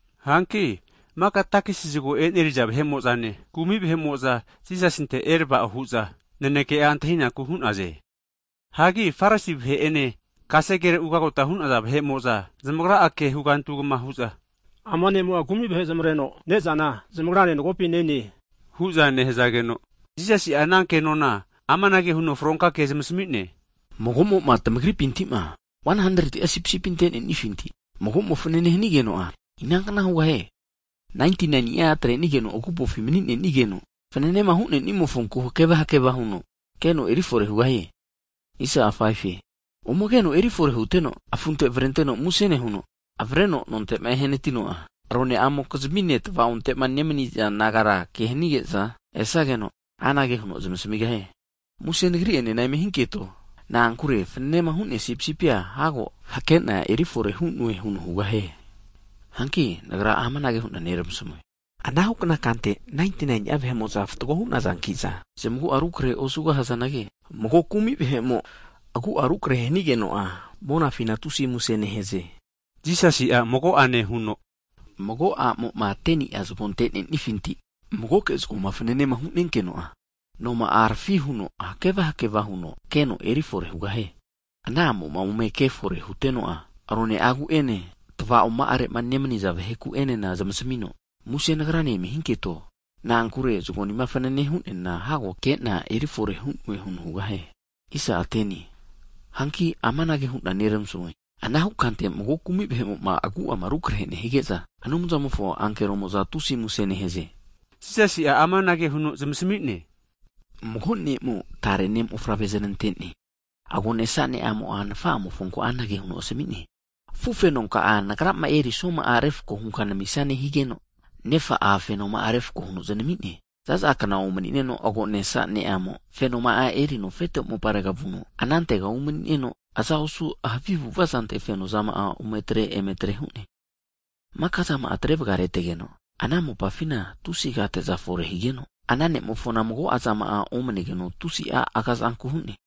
Hanki maka takisi zago e'neriza vahe'mo'zane, kumi vahe'mo'za Jisasinte erava'o hu'za naneke'a antahinaku hu'naze. Hianagi Farisi vahe'ene kasegere ugota hu'naza (sraib) vahe'mo'za zamagra'a ke hugantu hugama hu'za, ama nemo'a kumi vahe zmareno ne'zana zamagrane magopi nene hu'za nehazageno, Jisasi'a ana kenona amanage huno fronka kea zamasami'ne, Mago'moma tamagripintima, 100'a sipisipi ante'nenifinti mago'mo fanane hanigeno'a inankna hugahie? 99ni'a zamatrenige'za agupofi mani'nenageno, fananema hu'nemofonku hakeva hakeva huno keno erifore hugahie. Ome keno eri fore huteno, afunte avrenteno muse nehuno, avreno nontema ehanatino'a, roneamokizmine tva'onte'ma nemaniza nagara ke hanige'za esageno, anage huno zmasamigahie. Muse nagri ene eme hinketo. Na'ankure fnanema hu'nea sipisipia hago hakena eri fore hu'noe huno hugahie! Hanki Nagra amanage hu'na neramasmue. Anahukna kante, 99ni'a vahe'mo'za fatgo hu'nazankiza zmagu'a rukrehe osugahazanagi, mago kumi vahe'mo, agu'a rukrehe nehigeno'a monafina tusi muse nehaze. Jisasi'a mago'ane huno, Mago a'mo'ma 10ni'a zago ante'nenifinti, magoke zagoma fanane hu'nenkeno'a, rampe tavi taginteno noma'a harafi huno hakeva hakeva huno keno eri fore hugahie. Ana a'mo'ma ome ke fore huteno'a, rone'agu'ene, tva'oma'are nemaniza vaheku'enena zmasamino, Muse nagrane eme hinketo, na'ankure zagonima fananema hu'neana hago hakena erifore hu'noe huno hugahie! Hanki amanage hu'na neramasmue, anahu kante mago kumi vahe'mo'ma agu'ama rukrahe'ma nehige'za, Anumzamofo ankeromo'za tusi muse nehaze. Jisasi'a amanage huno zamasmi'ne, Mago ne'mo tare ne' mofavre zanante'ne. Henka ne'amo nafa'amofonku anage huno asami'ne, afufeno ka'a nagrama eri snuama'a refko hunka namisnane higeno, nefa'a fenoma'a refko huno znami'ne. Zaza kna omanineno henka ne'amo, fenoma'a erino afete moparega vu'no anantega umani'neno, aza osu havi avu'avazante fenozama ome atre eme atre hu'ne. Maka'zama'a atre vagaretegeno, ana mopafina tusi agate'za fore higeno, ana ne'mofona mago'zama'a omnegeno tusi'a agazanku hu'ne.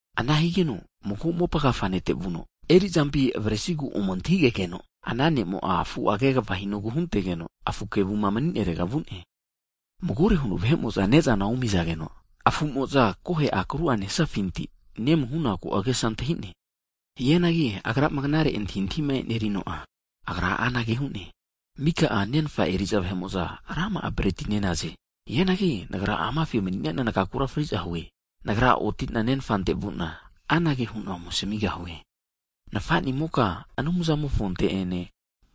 Ana higeno mago mopa agafa nete vuno, erizampi avresigu ome antahigegeno, ana nemo'a afu'a kegava hinogu huntegeno afu kevuma mani'narega vu'ne. Magore huno vahe'mo'za ne'zana omizageno, afumo'za kohe akru'a nenazafinti nemu hu'naku agesa antahintahi hu'ne. Hianagi agrama knare antahintahima e'nerino'a, agra'a anage hu'ne. Mika'a nenfa eri'za vahe'mo'za rama'a breti nenaze. Hianagi nagra amafi mani'nena nagakura fri'za hue! Nagra otina nenfante vuna, anage hu'na ome asamigahue. Nafanimoka Anumzamofonte'ene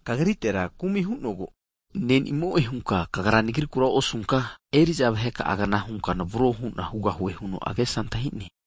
kagritera kumi hu'nogu, ne'nimo'e hunka kagra nagrikura osunka, eri'za vaheka'agna hunka navro hu'na hugahue huno agesa antahine.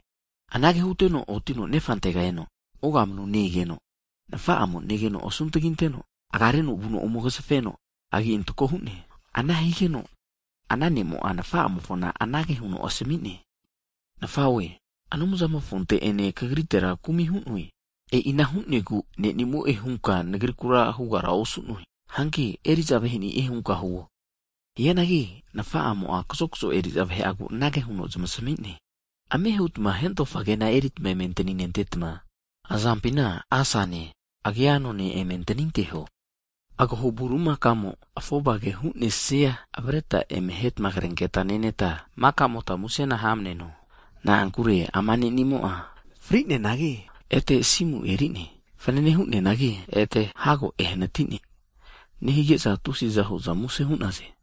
Anage huteno otino nefantega e'ne, ogamanu ne-egeno, nafa'amo negeno asuntaginteno, agareno vuno ome agazafeno, agi antako hu'ne. Ana nehigeno ana ne'amo anage huno nafa'amofo ome asmi'ne, Nafa'nimoke, Anumzamofonte ene kagrite'enena kumi hu'noe. E'ina hu'negu ne'nimo'e hunka nagrikura hugara osu'noe. Hanki eri'za vahe'ni'e hunka huo. Hianagi nafa'amo'a kazokzo eri'za vahe'agu anage huno zmasamine, ame hutma hentofa kena erita eme antaninentetma, azampina asane agia anone eme antaninteho. Agaho bulimakamo'ma afovage hu'nesia avreta eme ahetma, krenketa neneta maka'mota musena hamneno. Na'ankure ama ne'nimo'a fri'neanagi, ete asimu eri'ne. Fanane hu'neanagi, ete hago ehanatine, nehige'za tusi'za hu'za muse hu'naze.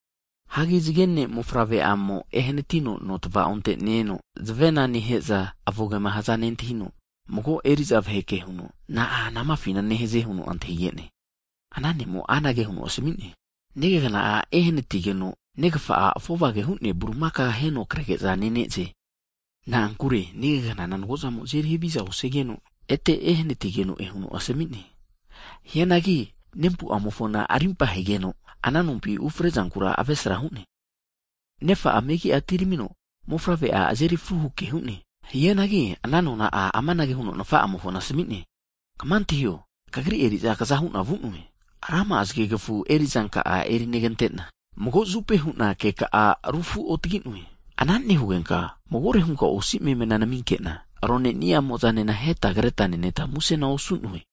Hagi zage ne'mofavre'amo ehanatino nomofo tva'onte ne-eno, zavena neheza avogema nehazana nentahino, mago eri'za vahe ke huno, na'a anamafina nehaze huno antahige'ne. Ana ne'mo'a anage huno asmi'ne, negagna'a ehanatigeno negafa'a afovage hu'nea agaho bulimakao aheno krege'za nene'ze. Na'ankure negagnana mago'zamo'a azeri haviza osigeno ete ehanatigeno'e huno asmine. Hianagi nempu'amofona rimpa hegeno, ana nompima ufrezankura avesra hu'ne. Nefa'a megia atiramino mofavre'a azeri fru huke hu'ne. Hianagi ana nona'a amanage huno nafa'amofona asmi'ne, kama antahio! Kagri eri'zana kazahu'na vu'noe. Rama'a zagegfufi erizanka'a erinegantena, mago zupe hu'na keka'a rufu'otaginoe. Ana nehugenka magore hunka osi memena naminkena, rone ni'amozanena aheta kreta neneta musena osu'noe.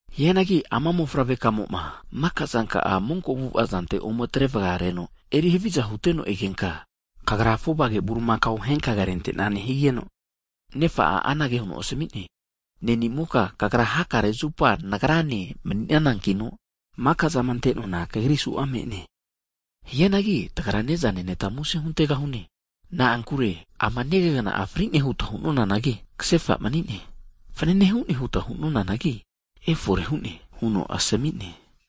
Hianagi ama mofavre kamoma maka zanka'a monko avu'avazante ome atre vagareno eri haviza huteno egenka, kagra afovage agaho bulimakao ahenka krente'nane. Higeno nefa'a anage huno asmi'ne, ne'nimoka kagra hakare zupa nagrane mani'nanankino, maka'zama ante'noana, Kagri su'a me'ne. Hianagi tagra neza neneta muse huntegahune. Na'ankure ama negagna'a fri'ne huta hu'noanagi, kasefa huno mani'ne. Fanane hu'ne huta hunanagi, efore hu'ne huno asami'ne.